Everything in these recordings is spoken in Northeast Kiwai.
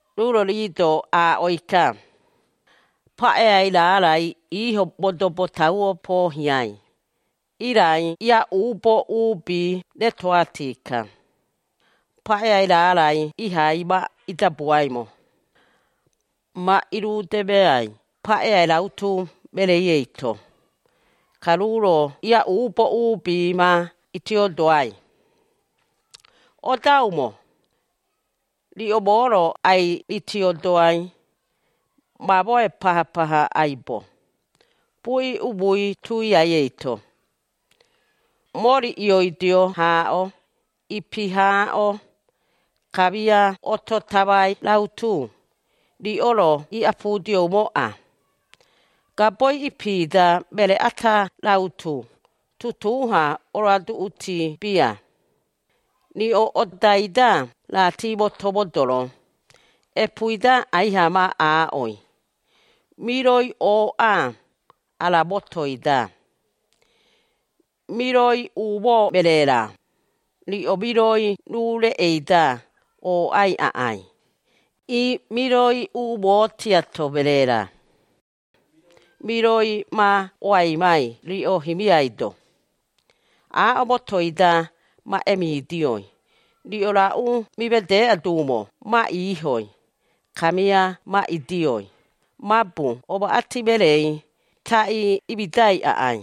Ruu-ro rii-do aaꞌoi-ka, “Paꞌeai raarai iiho modobo tauo poohiai, irai iaꞌuubo uubi retoꞌati-ka, paꞌeai raarai ihai ma idabuaimo. Ma irudemeai paꞌeai rautu mereei eito, ka ruu-ro iaꞌuubo uubi ma itiodoai. Odaumo! Riꞌo moo-ro ai-ritiodoai mamoe paha-paha aibo, buꞌi umui tuiai eito. Mori ioidio haaꞌo, ipi haaꞌo, kamia oto tamai rautu, riꞌo-ro iꞌapudioumoꞌa. Gaboi ipi-da meree ata rautu tutuu-ha oroaduꞌuti bia. Riꞌo odai-da raati moto modoro, epuui aiha ma aaꞌoi, ‘Miroi ooꞌa, ara motoi-da.’ Miroi umoo meree-ra, riꞌo miroi ruu reꞌei-da ooꞌai aꞌai, ii miroi umoo tiato meree-ra, miroi ma oaimai riꞌo himiai-do. Aaꞌo motoi-da ma emidioi, riꞌo raꞌu mimedeꞌa duumo ma iihoi, kamia ma idioi, mabu omaꞌati mereei taꞌii imidai aꞌai.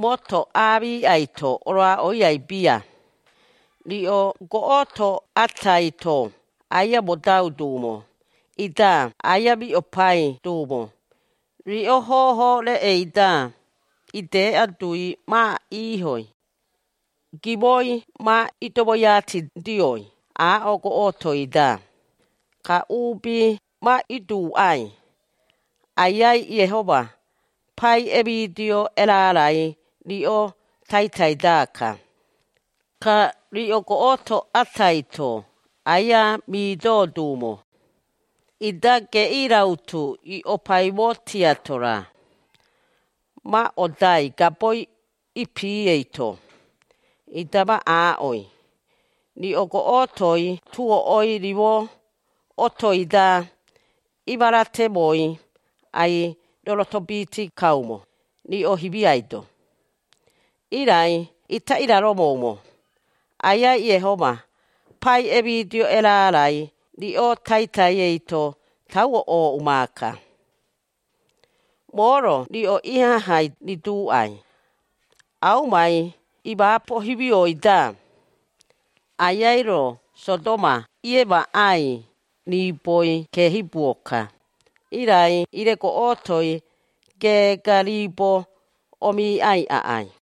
Moto aamiꞌai-to oroaꞌoiai bia. Riꞌo goꞌoto atai-to aia modau duumo, ida aia mioꞌopai duumo, riꞌo hoho reꞌei-da ideꞌa, dui ma iihoi. Gimoi ma idomoiatidioi aaꞌo goꞌotoi-da, ka uubi ma iduuꞌai, ‘Aiai Iehoma pai emidio erarai riꞌo taitai-daka.’ Ka riꞌo goꞌoto atai-to aia midoo duumo, ida geꞌii rautu ioꞌopaimo tiato-ra, ma odai gaboi ipi eito, ida ma aaꞌoi, ‘Riꞌo goꞌotoi tuoꞌoi, rimo otoi-da imaratemoi, ai-rorotobiiti kaumo, riꞌo himiai-do. Irai ita iraromoumo, Aiai Iehoma pai emidio erarai riꞌo taitai eito, tauo ooꞌu maaka.’ Moo-ro riꞌo iaha hiꞌai riduuꞌai, aumai iimaapo himioi-da, Aiai-ro Sodoma iemaꞌai riiboi keehibuo-ka, irai ire goꞌotoi, geega riibo omiiꞌai aꞌai.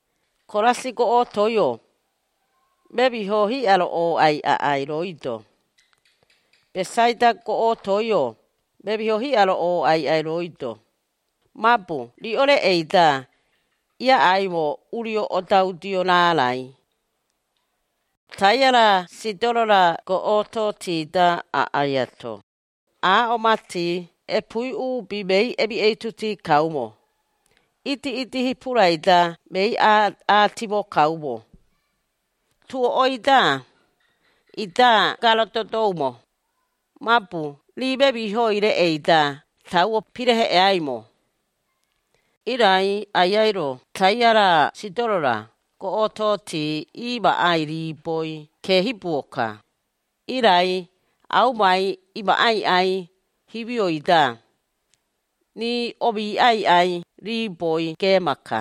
“Korasi goꞌotoi-o, memiho hiꞌa-ro ooꞌai aꞌai, rooi-do! Besaida goꞌotoi-o, memihoi hiꞌa-ro ooꞌai aꞌai, rooi-do! Mabu riꞌo reꞌei-da, iaꞌaimo urio odaudio raarai, Taia-ra Sidoro-ra goꞌototi-da aꞌai ato, aaꞌo mati epuui uubi mei emiꞌeituti kaumo, idiꞌidi hipurai-da mei aatimo kaumo, tuoꞌoi-da, ida garadodoumo, mabu rii memihoi reꞌei-da tauo pireheꞌeaimo. Irai Aiai-ro Taia-ra Sidoro-ra goꞌototi iimaꞌai riiboi keehibuo-ka, irai aumai iimaapoi aꞌai himioi-da, riꞌo omiiꞌai aꞌai riiboi geema-ka.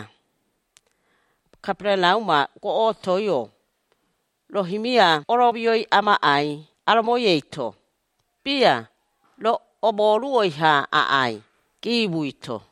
Kaperarauma goꞌotoi-o, roo himia oroomioi amaꞌai aromoi eito? Bia, roo omooruoi-ha aꞌai, giimui-to.”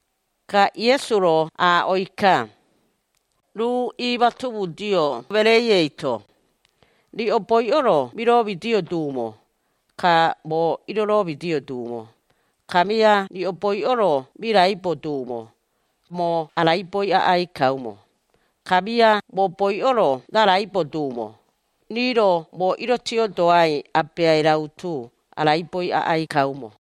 Ka Iesu-ro aaꞌoi-ka, ruu iimatomudio mereei eito, “Riꞌo boiꞌo-ro miroomidio duumo, ka moo iroromidio duumo, kamia riꞌo boiꞌo-ro miraibo duumo, moo araiboi aꞌai kaumo, kamia moo boiꞌo-ro raraibo duumo, rii-ro moo irotiodoai abeai rautu araiboi aꞌai kaumo.”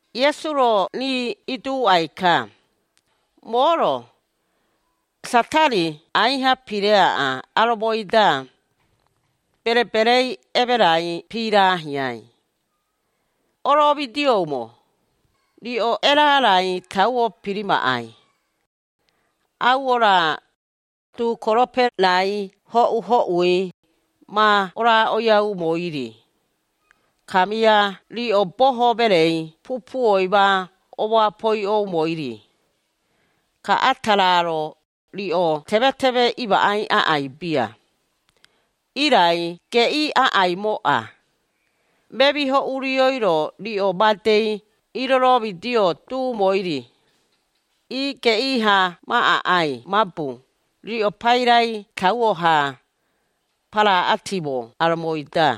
Iesu-ro rii iduuꞌai-ka, “Moo-ro, Satari aiha pireaꞌa aromoi-da, bereberei emerai piiraahiai. Oromidioumo! Riꞌo erarai tauo pirimaꞌai, auo-ra, duukorope-rai hoꞌu-hoꞌui, ma oroaꞌoiaumoi-ri, kamia riꞌo Boho Mereei pupuoi ma omoapoiꞌoumoi-ri, ka ata raa-ro, riꞌo temeteme imaꞌai aꞌai bia. Irai geꞌii aꞌaimoꞌa, memiho urioi-ro riꞌo madei iiromidio duumoi-ri, ii geꞌii-ha ma aꞌai, mabu riꞌo pairai tauo-ha, paraꞌatiimo aromoi-da.”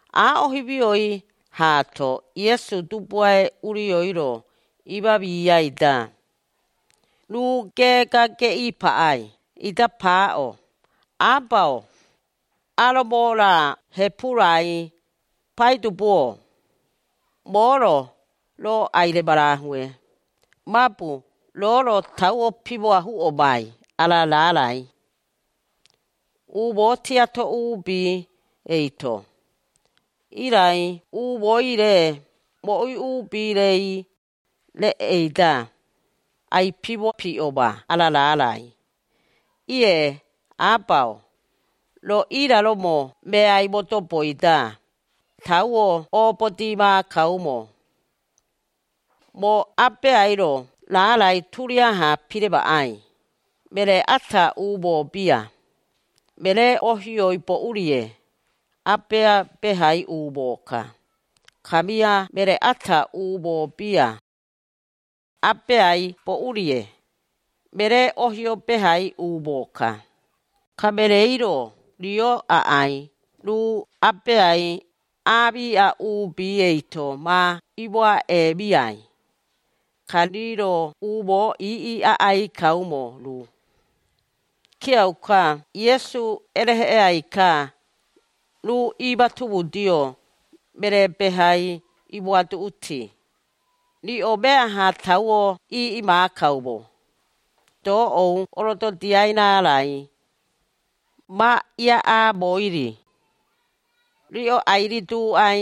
Aaꞌo himioi haato, Iesu Dubuae Urioi-ro iimamiai-da, ruu geega geꞌii paꞌai, ida paaꞌo, “Aba-o, aromo-ra hepu-rai, Paidubu-o! Moo-ro, roo ai-remarahue, mabu roo-ro tauo pimoahuꞌomai ara raarai, umoo tiatoi uubi eito, irai umooi-re moꞌui uubi-rei, reꞌei-da, ai-pimopiꞌoma ara raarai. Ie, Aba-o, roo iraromo meai modoboi-da, tauo oobodii maakaumo. “Moo Abeai-ro raarai turiaha piremaꞌai. Meree ata umoo bia, meree-ohioi boꞌu-rie, Abea behai umoo-ka, kamia meree ata umoo bia, Abeai boꞌu-rie, meree-ohio behai umoo-ka. Ka mereei-ro rio aꞌai ruu abeai aamiꞌa uubi eito ma imoaꞌemiai, ka rii-ro umoo iiꞌi aꞌai kaumo ruu.” Kiauka Iesu ereheꞌeai-ka, ruu iimatomudio meree behai imoaduꞌuti, “Riꞌo meaha tauo iiꞌi maakaumo, doꞌou orododiai raarai, ma iaꞌaamoi-ri. Riꞌo ai-riduuꞌai,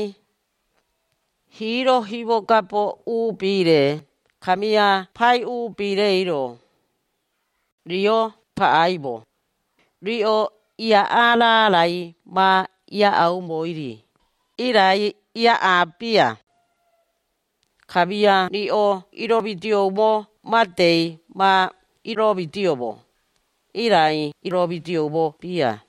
hiiro himogabo uubi-re, kamia Pai uubi-reiro, rio paꞌaimo, riꞌo iaꞌaa raarai ma iaꞌaumoi-ri, irai iaꞌaa bia, kamia riꞌo iromidioumo madei ma iromidioumo, irai iromidioumo bia.”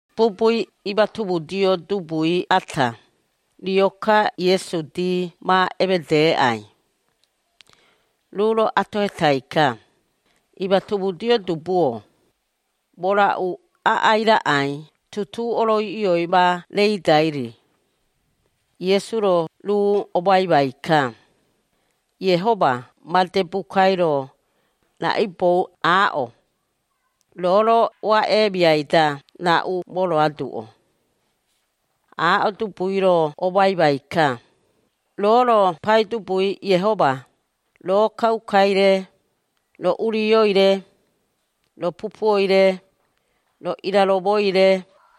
Bubui imatomudio dubui ata, rio-ka Iesu dii ma emedeeꞌai, ruu-ro atohetai-ka, “Imatomudio dubu-o, moo raꞌu aꞌai raꞌai tutuu oroiꞌioi ma reidai-ri?” Iesu-ro ruu omoaimai-ka, “Iehoma made bukai-ro, raꞌaibou aaꞌo? Roo-ro oaꞌeemiai-da raꞌu moroaduꞌo?” Aaꞌo dubui-ro omoaimai-ka, “Roo-ro Paidubui Iehoma, roo kaukai-re, roo urioi-re, roo pupuoi-re, roo iraromoi-re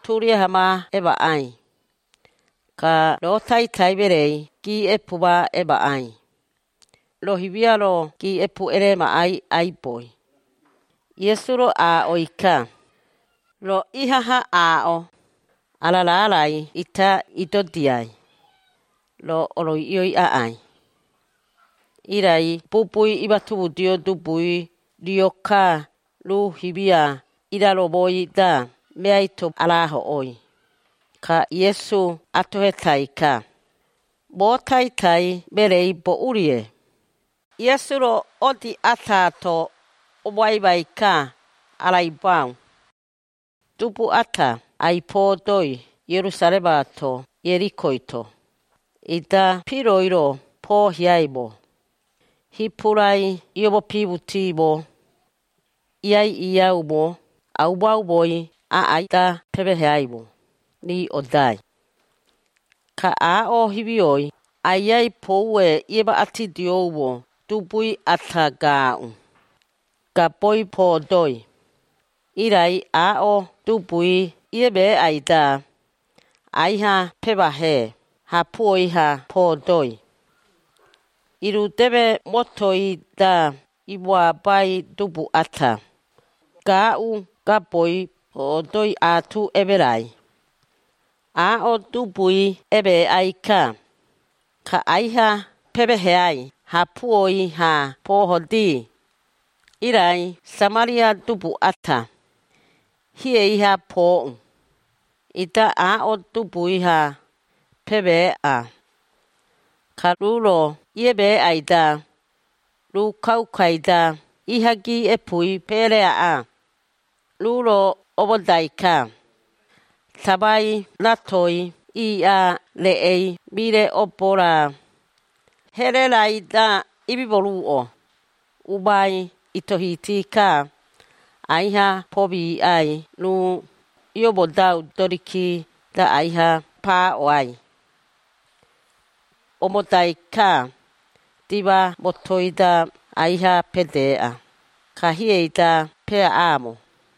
turiaha ma emaꞌai. Ka roo taitai mereei giiꞌepu ma emaꞌai, roo himia-ro giiꞌepu eremaꞌai aiboi.” Iesu-ro aaꞌoi-ka, “Roo ihaha aaꞌo, ara raarai ita idodiai, roo oroiꞌioi aꞌai.” Irai bubui imatomudio dubui rio-ka ruu himia iraromoi-da meai-to arahoꞌoi, ka Iesu atohetai-ka, “Moo taitai mereei boꞌu-rie?” Iesu-ro odii ataato omoaimai-ka araibau, “Dubu ata ai-poodoi Ierusaremaato Ierikoi-to, ida piroi-ro poohiaimo, hipurai imomopimutimo, iaiꞌiiaumo aumo-aumoi aꞌai-da pemeeheaimo, rii odai. Ka aaꞌo himioi Aiai poue iemaꞌatidioumo dubui ata gaaꞌu, gaboi poodoi, irai aaꞌo dubui iemeeꞌai-da, aiha pemahee hapuoi-ha poodoii. Irudeme motoi-da imoabai dubu ata, gaaꞌu gaboi poodoi aatu emerai, aaꞌo dubui emeeꞌai-ka, ka aiha pemeeheai hapuoi-ha poohodii. Irai Samaria dubu ata, hiei-ha pooꞌu, ida aaꞌo dubui-ha pemeeꞌa, ka ruu-ro iemeeꞌai-da, ruu kaukai-da iha giiꞌepui peereaꞌa. Ruu-ro oomodai-ka, tamai ratoi iiꞌaa reꞌei mire obo-ra, here raai-da imimoruꞌo, umai itohiti-ka, aiha pomiꞌai ruu iomodau doriki-da aiha paaꞌoai, omodai-ka dima motoi-da aiha pedeꞌa, ka hiei-da peaꞌaamo.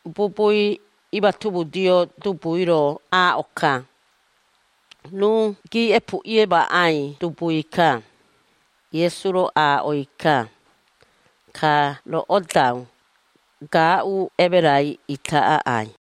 Bubui imatomudio dubui-ro aaꞌo-ka, “Ruu giiꞌepu iemaꞌai dubui-ka.” Iesu-ro aaꞌoi-ka, “Ka roo odau, gaaꞌu emerai ita aꞌai.”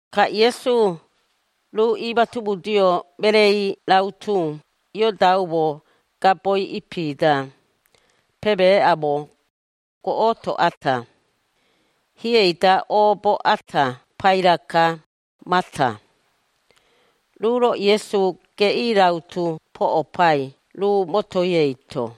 Ka Iesu, ruu iimatomudio mereei rautu iodaumo gaboi ipi-da, pemeeꞌaumo, goꞌoto ata. Hiei-da oobo ata paira-ka, Mata, ruu-ro Iesu geꞌii rautu poꞌopai ruu motoi eito.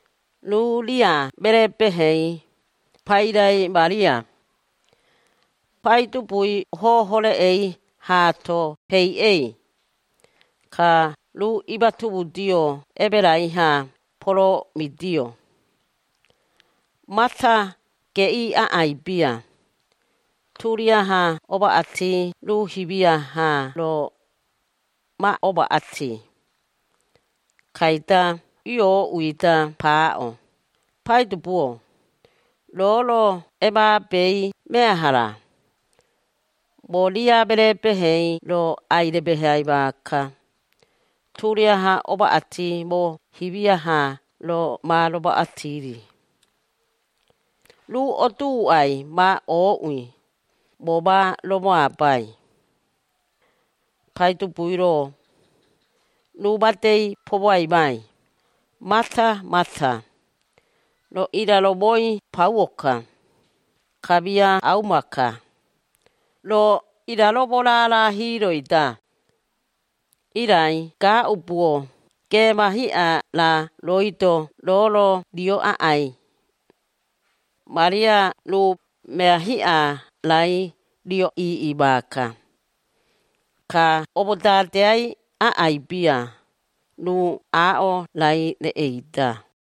Ruu ria meree-behei, pairai Maria, Paidubui hoho reꞌei haato peiꞌei, ka ruu imatomudio emerai-ha poroomidio. Mata geꞌii aꞌai bia, turiaha omaꞌati ruu himia haa-ro ma omaꞌati, kaida iooꞌui-da paaꞌo, “Paidubu-o, roo-ro emaabei meaha-ra? Moo ria meree-behei-ro ai-remeheai maaka, turiaha omaꞌati moo himia haa-ro ma romaꞌati-ri. Ruu oduuꞌai ma ooꞌui, moo ma romoabai!” Paidubui-ro, ruu madei pomoaimai, “Mata, Mata! Roo iraromoi pauo-ka, kamia auma-ka, roo iraromo raara hiiroi-da, irai gaaꞌubuo geema hiꞌa raa rooi-do, roo-ro rio aꞌai. Maria ruu, mea hiꞌa raai rio iiꞌi maaka, ka omodadeai aꞌai bia ruu aaꞌo raai reꞌei-da.”